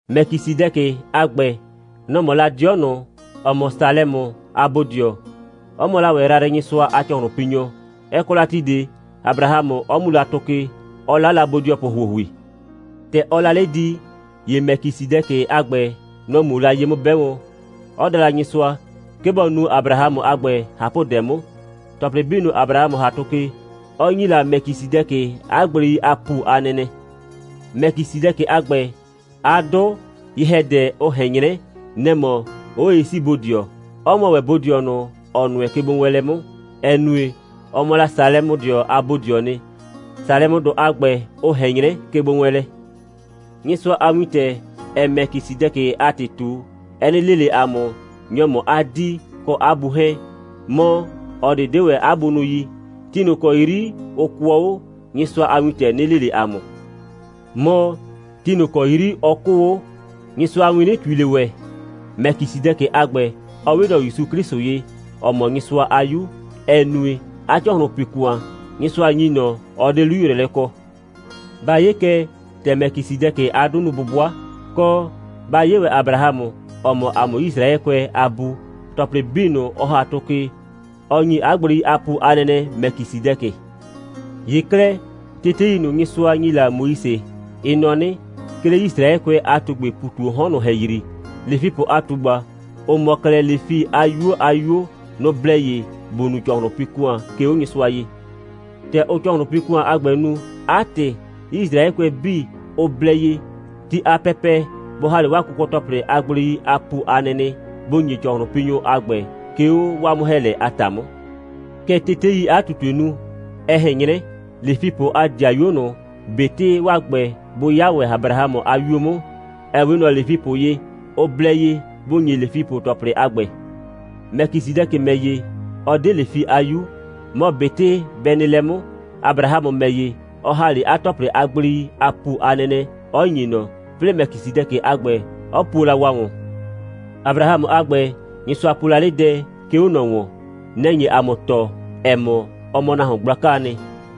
Mɛkisɩdɛkɩ a ‑gbɛ, nɔ‑ mɔ la 'dɩɔ ꞊nʋ, ‑ɔ mɔ Salɛmʋ a bodɩɔ, 'ɔ mɔ la ‑wɛ Yrayrɩnyɩsʋa a ‑cɔhlʋnpinyɔ. Ɛ kɔ la ti ꞊de, Abrahamʋ 'ɔ mu la tʋ ke, 'ɔ 'la la bodɩɔpʋ ‑huohui. ‑Tɛ ɔɔ la 'le di, ‑ye Mɛkisɩdɛkɩ a ‑gbɛ, nɔ‑ muo la ye 'mʋ 'bɛ wɔn, 'ɔ da Nyɩsʋa, 'ke bɔ nu Abrahamʋ a ‑gbɛ ꞊hapʋdɛ 'mʋ, ‑tɔplɩ 'bii ꞊nʋ, Abrahamʋ ‑ha tʋ ke, 'ɔ ‑nyi la Mɛkisɩdɛkɩ 'a gblei a ‑pu a nɛnɛ. Mɛkisɩdɛkɩ a ‑gbɛ, 'a 'dʋ, ye‑hɛdɛ, ʋ ꞊hɛn 'nyrɛ, nɛ‑ mɔ 'Oye'siibodɩɔ, 'ɔ mɔ ‑wɛ bodɩɔ ꞊nʋ, ‑ɔ nʋɛ kegbowɛɛnlɛ 'mʋ, ‑ɛ nue, ɔ mɔ la Salɛmʋdɩɔ a bodɩɔɔ nɩ. Salɛmʋdʋ a ‑gbɛ, ʋ ꞊hɛn 'nyrɛ kegbowɛɛnlɛ. Nyɩsʋa a wintɛ, ‑ɛɛ Mɛkisɩdɛkɩ a ‑tɩ ꞊tu, ɛ 'nɩ le ꞊le ‑a mʋ, nyɔ‑ mɔ 'a 'dii kɔ 'a bu 'hɛɛn. Mɔ, ꞊ɔ ꞊de 'de ‑wɛ 'a bunʋ yi. Ti ꞊nʋ ‑kɔ 'yri ʋ kʋɔ 'o, Nyɩsʋa a wintɛ 'nɩ le ꞊le ‑a mʋ. Mɔ, ti ꞊nʋ ‑kɔ 'yri ɔ 'kʋʋ 'o, Nyɩsʋa a win 'nɩ ꞊tui ꞊le ‑wɛ. Mɛkisɩdɛkɩ a ‑gbɛ, ɔ 'we ꞊nɔ ‑Yusu 'Klɩsʋ ye, ‑ɔ mɔ Nyɩsʋa a 'Yu, ‑ɛ nue, 'a ‑cɔhlʋnpi‑kʋan, Nyɩsʋa ‑nyi ꞊nɔ, ɔ 'de 'lu‑yrɛɛlɛ kɔ. Ba 'ye kɛ, ‑tɛ Mɛkisɩdɛkɩ a 'dʋ nu 'bʋbʋa, kɔ, ba 'ye ‑wɛ Abrahamʋ, ‑ɔ mɔ ‑a mʋ Yisraɛkʋɛ a bu. ‑Tɔplɩ 'bii ꞊nʋ, ɔ ‑ha tʋ ke, ɔ ‑nyi 'a gblei a ‑pu a nɛnɛ Mɛkisɩdɛkɩ. ‑Ye 'klɛɛ, tetei ꞊nʋ, Nyɩsʋa ‑nyi la Moise, ɩ nɔ 'nɩ, 'ke 'le Yisraɛkʋɛ a ꞊tugbɩɩ ‑pu ꞊tu 'o 'hɔn ꞊nʋ ‑hɛyri, Lefipʋ a ꞊tugba, ‑ʋ mɔ 'klɛɛ Lefi a 'yuo a 'yuo, nʋ‑ blɛ ye ‑bʋ nu ‑cɔhlʋnpi‑kʋan, 'ke 'o Nyɩsʋa ye. ‑Tɛ ʋʋ ‑cɔhlʋnpi‑kʋan a ‑gbɛ nu, 'a ‑tɩ, Yisraɛkʋɛ 'bii, ʋ blɛ ye, ti a pɛpɛ bʋ ‑ha 'le 'waa kʋkɔ‑tɔplɩ a gblei a ‑pu a nɛnɛ, bʋ ‑nye ‑cɔhlʋnpinyʋ a ‑gbɛ, 'ke 'o 'waa 'mʋ‑hɛɛlɛ a ‑ta 'mʋ. Kɛ teteii 'a ꞊tutue nu. Ɛ ꞊hɛn 'nyrɛ, Lefipʋ a ‑dɩayuo ꞊nʋ, ꞊betɩ 'waa ‑gbɛ, bʋ 'ya ‑wɛ Abrahamʋ a 'yuo 'mʋ, ‑ɛ 'we ꞊nɔ Lefipʋ ye, ʋ blɛ ye bʋ ‑nyi Lefipʋ ‑tɔplɩ a ‑gbɛ. Mɛkisɩdɛkɩ ‑mɛ ‑ye, ɔ 'de Lefi a 'yu. Mɔ ꞊betɩ bɛ nɩ lɛ 'mʋ, Abrahamʋ ‑mɛ ‑ye, ɔ ‑ha 'le 'a ‑tɔplɩ a gblei a ‑pu a nɛnɛ, 'ɔ ‑nye ꞊nɔ, 'plɩɩ Mɛkisɩdɛkɩ a ‑gbɛ, 'ɔ puo la wa ‑wɔn. Abrahamʋ a ‑gbɛ, Nyɩsʋa po la 'le dɛ, 'ke 'o ꞊nɔ ‑wɔn. Nɛ‑ nye ‑a mʋ tɔɔ, ‑ɛ mɔ, ɔ mɔ nahuon gblakaa nɩ,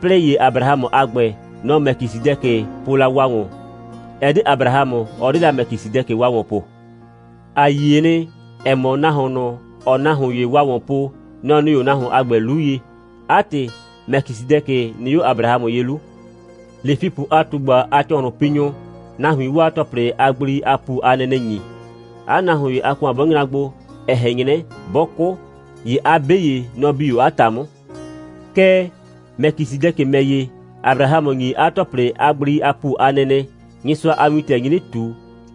'plɩɩ ‑ye Abrahamʋ a ‑gbɛ, nɔ‑ Mɛkisɩdɛkɩ po la wa ‑wɔn. Ɛ 'de Abrahamʋ, ɔ 'de la Mɛkisɩdɛkɩ wa ‑wɔn po. ‑A yie nɩ, ‑ɛ mɔ, nahuon ꞊nʋ, ‑ɔɔ nahuon ‑ye wa ‑wɔn po, nɔ‑ nɩ 'o nahuon a ‑gbɛ 'lu ye. 'A ‑tɩ, Mɛkisɩdɛkɩ nɩ 'o Abrahamʋ ye 'lu. Lefipʋ a ꞊tugba a ‑cɔhlʋnpinyʋ, nahuiin 'waa ‑tɔplɩ a gblei a ‑pu a nɛnɛ ‑nyi, 'a nahuon ‑ye a ‑kʋan 'bɔ nyra gbo, ‑ɛ ꞊hɛn 'nyrɛ, 'bɔ 'kʋ, ‑ye 'a 'be ‑ye, nɔ‑ bi 'o 'a ‑ta 'mʋ. Kɛɛ, Mɛkisɩdɛkɩ ‑mɛ ‑ye, Abrahamʋ ‑nyi 'a ‑tɔplɩ a gblei a ‑pu a nɛnɛ, Nyɩsʋa a wintɛ nyi 'nɩ ꞊tu,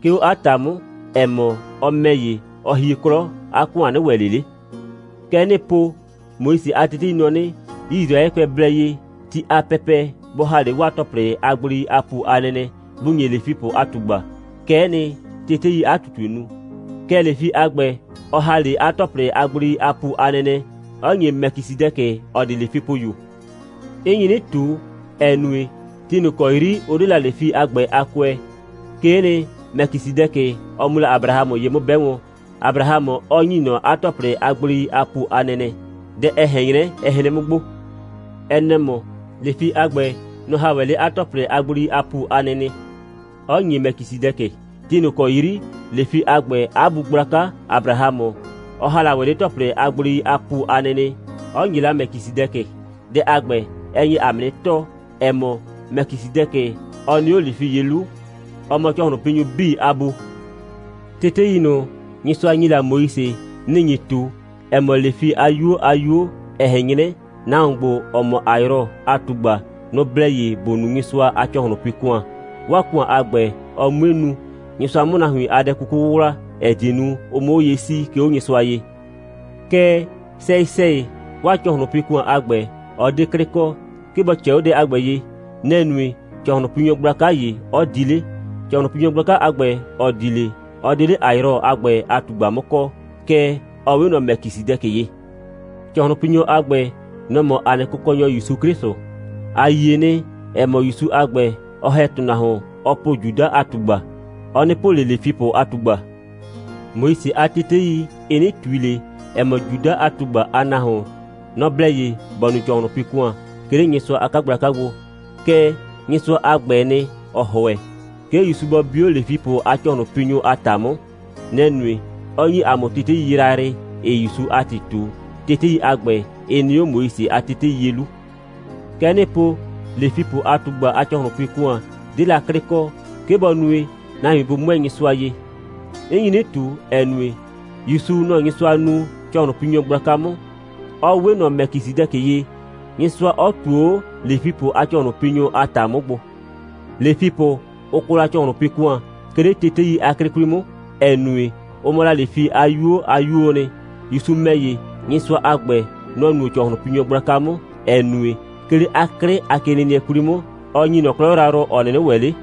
'ke 'o 'a ‑ta 'mʋ, ‑ɛ mɔ, ɔ ‑mɛ ‑ye, ɔ hie 'klɔ, 'a ‑kʋan 'nɩ ‑wɛ ꞊le 'le. Kɛ 'nɩɩ po: Moise a tetei nɔ 'nɩ, Yisraɛkʋɛ blɛ ye, ti a pɛpɛ bʋ ‑ha 'le 'waa ‑tɔplɩ a gblei a ‑pu a nɛnɛ, bʋ ‑nye Lefipʋ a ꞊tugba. Kɛ'ɛ nɩ, teteii 'a ꞊tutue nu. Kɛɛ, Lefi a ‑gbɛ, ɔ ‑ha 'le 'a ‑tɔplɩ a gblei a ‑pu a nɛnɛ, 'ɔ ‑nye Mɛkisɩdɛkɩ, ‑ɔ 'de Lefipʋyu. 'N nyi 'nɩ ꞊tu, ‑ɛ nue, ti ꞊nʋ ‑kɔ 'yri ʋ 'de la Lefi a ‑gbɛ a kʋɛ, 'kee nɩ, Mɛkisɩdɛkɩ, ɔ mu la Abrahamʋ ye 'mʋ 'bɛ wɔn, Abrahamʋ 'ɔ ‑nyi ꞊nɔ 'a ‑tɔplɩ a gblei a ‑pu a nɛnɛ. Dɛ, ɛ ꞊hɛn 'nyrɛ, ɛ hren 'mʋ gbo. Ɛ nɛ‑ mɔ: Lefi a ‑gbɛ, nɔ‑ ‑ha ‑wɛ 'le 'a ‑tɔplɩ a gblei a ‑pu a nɛnɛ, 'ɔ ‑nye Mɛkisɩdɛkɩ, ti ꞊nʋ ‑kɔ 'yri Lefi a ‑gbɛ a bu gblaka Abrahamʋ, ɔ ‑ha la 'le 'a ‑tɔplɩ a gblei a ‑pu a nɛnɛ, 'ɔ ‑nye la Mɛkisɩdɛkɩ. Dɛ a ‑gbɛ, ɛ nye ‑a mʋ 'nɩ tɔɔ, ‑ɛ mɔ, Mɛkisɩdɛkɩ, ɔ nɩ 'o Lefi ye 'lu, ‑ɔ mɔ ‑cɔhlʋnpinyʋ 'bii a bu. Tetei ꞊nʋ, Nyɩsʋa ‑nyi la Moise, nɩ‑ nyi ꞊tu, ‑ɛ mɔ, Lefi a 'yuo a 'yuo, ‑ɛ ꞊hɛn 'nyrɛ, nahuon ‑gbo, ‑ɔ mɔ Ayrɔ a ꞊tugba, nʋ‑ blɛ ye ‑bʋ nu Nyɩsʋa a ‑cɔhlʋnpi‑kʋan, 'waa ‑kʋan a ‑gbɛ, ɔ 'mue nu, Nyɩsʋa 'mʋ nahuin a dɛ 'kuku 'wʋwla, ‑ɛ die nu, ʋ 'mʋ 'o ye 'sii, 'ke 'o Nyɩsʋa ye. Kɛɛ, sɛyɩ‑sɛyɩ, 'waa ‑cɔhlʋnpi‑kʋan a ‑gbɛ, ɔ 'de 'klɩ kɔ, 'ke bɔ ꞊cɛɛ 'o dɛ a ‑gbɛ ye. Nɛ‑ nue, ‑cɔhlʋnpinyɔ gblaka ‑ye, 'ɔ di 'le. ‑Cɔhlʋnpinyɔ gblaka a ‑gbɛ, ‑ɔ di 'le, ɔ 'de 'le Ayrɔ a ‑gbɛ a ꞊tugba 'mʋ kɔɔ, kɛɛ, ɔ 'we ꞊nɔ Mɛkisɩdɛkɩ ye. ‑Cɔhlʋnpinyɔ a ‑gbɛ, nɔ‑ mɔ ‑a nɩ Kʋkɔnyɔ ‑Yusu 'Klɩsʋ. ‑A yie nɩ, ‑ɛ mɔ, ‑Yusu a ‑gbɛ, ‑ɔ ‑hɛ ‑tʋnahuon, ɔɔ po Juda a ꞊tugba. (Ɔ 'nɩ po ꞊le Lefipʋ a ꞊tugba.) Moise a tetei, ɩ 'nɩ ꞊tui ꞊le, ‑ɛ mɔ, Juda a ꞊tugba a nahuon, nɔ‑ blɛ ye ‑bɔ nu ‑cɔhlʋnpi‑kʋan, 'ke 'le Nyɩsʋa a 'kagblaka gbo. Kɛɛ, Nyɩsʋa a ‑gbɛɛ nɩ, ‑ɔ ‑hʋɛ, 'ke ‑Yusu bɔ bi 'o Lefipʋ a ‑cɔhlʋnpinyʋ a ‑ta 'mʋ. Nɛ‑ nue, 'ɔ ‑nyi ‑a mʋ tetei yrayrɩ, 'ɩɩ ‑Yusu a ‑tɩ ꞊tu. Tetei a ‑gbɛ, ɩ nɩ 'o Moise a tetei ye 'lu. Kɛ 'nɩɩ po: Lefipʋ a ꞊tugba a ‑cɔhlʋnpi‑kʋan 'de la 'klɩ kɔ, 'ke bɔ nue, nahuin bʋ 'mʋɛɛ Nyɩsʋa ye. 'N nyi 'nɩ ꞊tu, ‑ɛ nue, ‑Yusu, nɔ‑ Nyɩsʋa nuu ‑cɔhlʋnpinyɔ gblaka 'mʋ, 'ɔ 'we ꞊nɔ Mɛkisɩdɛkɩ ye, Nyɩsʋa 'ɔ ꞊tuo 'o Lefipʋ a ‑cɔhlʋnpinyʋ a ‑ta 'mʋ gbo. Lefipʋ, ʋ kɔ la ‑cɔhlʋnpi‑kʋan, 'ke 'le tetei a 'klɩ 'kwli 'mʋ, ‑ɛ nue, ʋ mɔ la Lefi a 'yuo a 'yuoo nɩ. ‑Yusu ‑mɛ ‑ye, Nyɩsʋa a ‑gbɛ, nɔ‑ nuo ‑cɔhlʋnpinyɔ gblaka 'mʋ, ‑ɛ nue, 'ke 'le 'a 'klɩ a kenɩnɩɛ 'kwli 'mʋ, ɔ ‑nyi ꞊nɔ 'klɔ yrayrʋ, ‑ɔ 'nɩnɩ ‑wɛ 'le.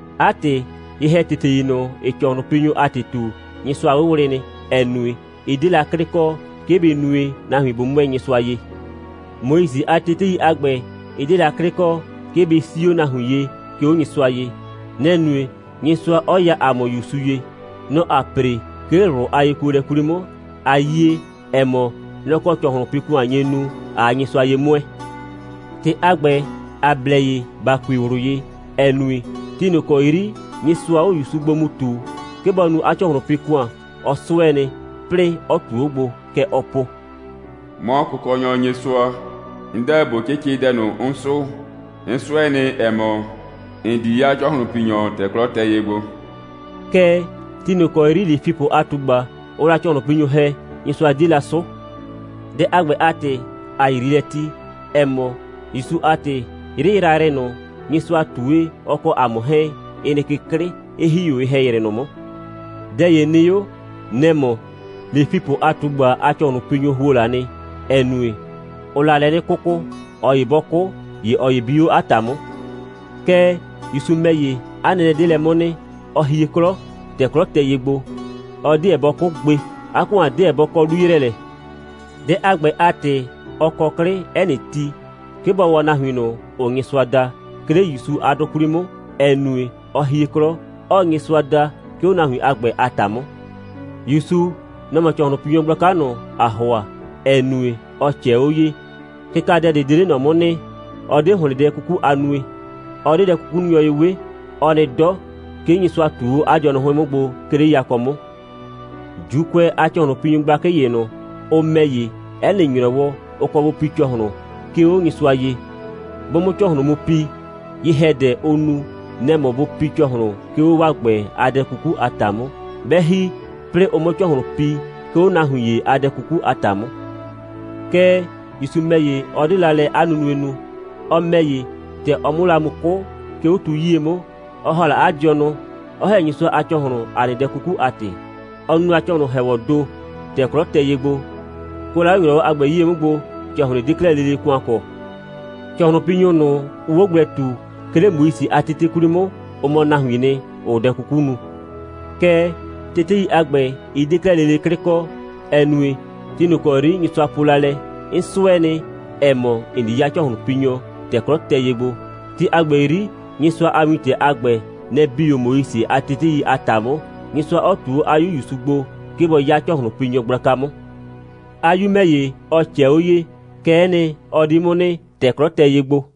'A ‑tɩ, ye‑hɛtetei ꞊nʋ, ‑ɩɩ ‑cɔhlʋnpinyʋ a ‑tɩ ꞊tu, Nyɩsʋa 'wʋwlɩ nɩ, ‑ɛ nue, ɩ 'de la 'klɩ kɔ, 'ke bɩ nue, nahuin bʋ 'mʋɛɛ Nyɩsʋa ye. Moise a tetei a ‑gbɛ, ɩ 'de la 'klɩ kɔ, 'ke bɩ 'sii 'o nahuin ye, 'ke 'o Nyɩsʋa ye. Nɛ‑ nue, Nyɩsʋa 'ɔ ya ‑a mʋ ‑Yusu ye. Nɔ‑ ‑aa ‑pre, 'ke 'le ꞊wlʋ a yekuolɛ 'kwli 'mʋ, ꞊a yie, ‑ɛ mɔ, nɔ‑ kɔ ‑cɔhlʋnpi‑kʋan nye nu, ꞊aa Nyɩsʋa ye 'mʋɛɛ. ‑Tɩ a ‑gbɛ, ‑a blɛ ye ‑ba kui ꞊wlʋ ye, ‑ɛ nue, ti ꞊nʋ ‑kɔ 'yri Nyɩsʋaa 'o ‑Yusu gbo mu ꞊tuu, 'ke bɔ nu 'a ‑cɔhlʋnpi‑kʋan, ɔ 'sʋɛ nɩ, 'plɩɩ 'ɔ ꞊tuo 'o gbo. Kɛ ɔɔ po: «'Mɔ Kʋkɔnyɔ Nyɩsʋa, 'n 'deɛ ꞊bo 'cɩcɩ dɛ ꞊nʋ, 'n 'sʋʋ. 'N 'sʋɛ nɩ, ‑ɛ mɔ, ‑n di 'ya ‑cɔhlʋnpinyɔ, ‑tɛ 'klɔ tɛ ye gbo.» Kɛɛ, ti ꞊nʋ ‑kɔ 'yri Lefipʋ a ꞊tugba, ʋʋ la ‑cɔhlʋnpinyʋ ‑hɛ, Nyɩsʋa 'die la 'sʋʋ. Dɛ a ‑gbɛ a ‑tɩ, ‑a yrii lɛ ti, ‑ɛ mɔ, ‑Yusu a ‑tɩ, 'yrɩ yrayrɩ ꞊nʋ, Nyɩsʋa ꞊tue, ɔ kɔ ‑a mʋ 'hɛɛn, ɩ nɩ ke 'klɩ, 'ɩ ‑hie 'o ye‑hɛyrɩ ꞊nʋ 'mʋ. Dɛ ‑ye nɩ 'o. Nɛ‑ mɔ: Lefipʋ a ꞊tugba a ‑cɔhlʋnpinyʋ ‑huo la nɩ, ‑ɛ nue, ʋʋ la lɛ 'nɩ 'kʋkʋ. ꞊Ɔ ‑ye 'bɔ 'kʋ, ‑ye ꞊ɔ ‑ye bi 'o 'a ‑ta 'mʋ. Kɛɛ, ‑Yusu ‑mɛ ‑ye, 'a nɛnɛ 'de lɛ 'mʋ nɩ. Ɔ hie 'klɔ, ‑tɛ 'klɔ tɛ ye gbo. Ɔ 'deɛ bɔ 'kʋ gbe. 'A ‑kʋan 'deɛ bɔ kɔ 'lu‑yrɛɛlɛ. Dɛ a ‑gbɛ a ‑tɩ, ɔ kɔ 'klɩ 'ɛ nɩ ti, 'ke bɔ waa nahuin ꞊nʋ, ‑ʋʋ Nyɩsʋa da, 'ke 'le ‑Yusu a 'dʋ 'kwli 'mʋ, ‑ɛ nue, ɔ hie 'klɔ, 'ɔɔ Nyɩsʋa da, 'ke 'o nahuin a ‑gbɛ a ‑ta 'mʋ. ‑Yusu, nɔ‑ mɔ ‑cɔhlʋnpinyɔ gblaka ꞊nʋ, ‑aa ‑hʋa, ‑ɛ nue, ɔ ꞊cɛɛ 'o ye. Kɩkadɛ ꞊de 'de 'le ꞊nɔ 'mʋ nɩ. Ɔ 'de ‑hlɩn dɛ 'kuku a nue. Ɔ 'de dɛ'kukununyʋ ye 'we. Ɔ nɩ 'dɔ. 'Ke Nyɩsʋa ꞊tuo 'o 'a dɩɔnʋ 'hʋɩn 'mʋ gbo, 'ke 'le yakɔ 'mʋ. ‑Juukʋɛ a ‑cɔhlʋnpinyʋ gblakɩ ‑ye ꞊nʋ, ʋ ‑mɛ ‑ye, 'ɛ nɩ ‑nyrɔwɔ, ʋ kɔ bʋ pi ‑cɔhlʋn, 'ke 'o Nyɩsʋa ye. 'Bʋ 'mʋ ‑cɔhlʋn mu pi, ye‑hɛdɛ, ʋʋ nu, nɛ‑ mɔ bʋ pi ‑cɔhlʋn, 'ke 'o 'waa ‑gbɛ a dɛ 'kuku a ‑ta 'mʋ. 'Bɛ ‑hi, 'plɩɩ ʋ 'mʋ ‑cɔhlʋn pi, 'ke 'o nahuin ‑ye a dɛ 'kuku a ‑ta 'mʋ. Kɛɛ, ‑Yusu ‑mɛ ‑ye, ɔ 'de la lɛ 'a nunue nu. Ɔ ‑mɛ ‑ye, ‑tɛ ɔ 'mʋ la mu 'kʋ, 'ke 'o tu 'yie 'mʋ, ɔ ‑ha la 'a dɩɔnʋ, 'ɔ ‑hɛ Nyɩsʋa a ‑cɔhlʋn, ‑a nɩ dɛ 'kuku a ‑tɩ. Ɔ nu la ‑cɔhlʋn‑hɛɛwɔɔ ‑do, ‑tɛ 'klɔ tɛ ye gbo. Kʋɛ la 'le ‑nyrɔwɔ a ‑gbɛ 'yie 'mʋ gbo, ‑cɔhlɩn ꞊de 'de 'klɛɛ lele ‑kʋan kɔ. ‑Cɔhlʋnpinyʋ ꞊nʋ, ʋʋ 'o gblɛ ꞊tu, 'ke 'le Moise a tetei a 'klɩ 'kwli 'mʋ, ʋ mɔ nahuiin nɩ, ‑ʋʋ dɛ 'kuku nu. Kɛɛ, tetei a ‑gbɛ, ɩ 'de 'klɛɛ lele 'klɩ kɔ, ‑ɛ nue, ti ꞊nʋ ‑kɔ 'yri Nyɩsʋa po la lɛ: «'N 'sʋɛ nɩ, ‑ɛ mɔ, ‑n di 'ya ‑cɔhlʋnpinyɔ, ‑tɛ 'klɔ tɛ ye gbo,» ti a ‑gbɛ 'yri Nyɩsʋa a wintɛ a ‑gbɛ, nɛ‑ bi 'o Moise a tetei a ‑ta 'mʋ, Nyɩsʋa 'ɔ ꞊tu 'o 'a 'Yu ‑Yusu gbo, 'ke bɔ 'ya ‑cɔhlʋnpinyɔ gblaka 'mʋ. 'A 'Yu ‑mɛ ‑ye, ɔ ꞊cɛɛ 'o ye. Kɛ'ɛ nɩ, ɔ di 'mʋ nɩ, ‑tɛ 'klɔ tɛ ye gbo.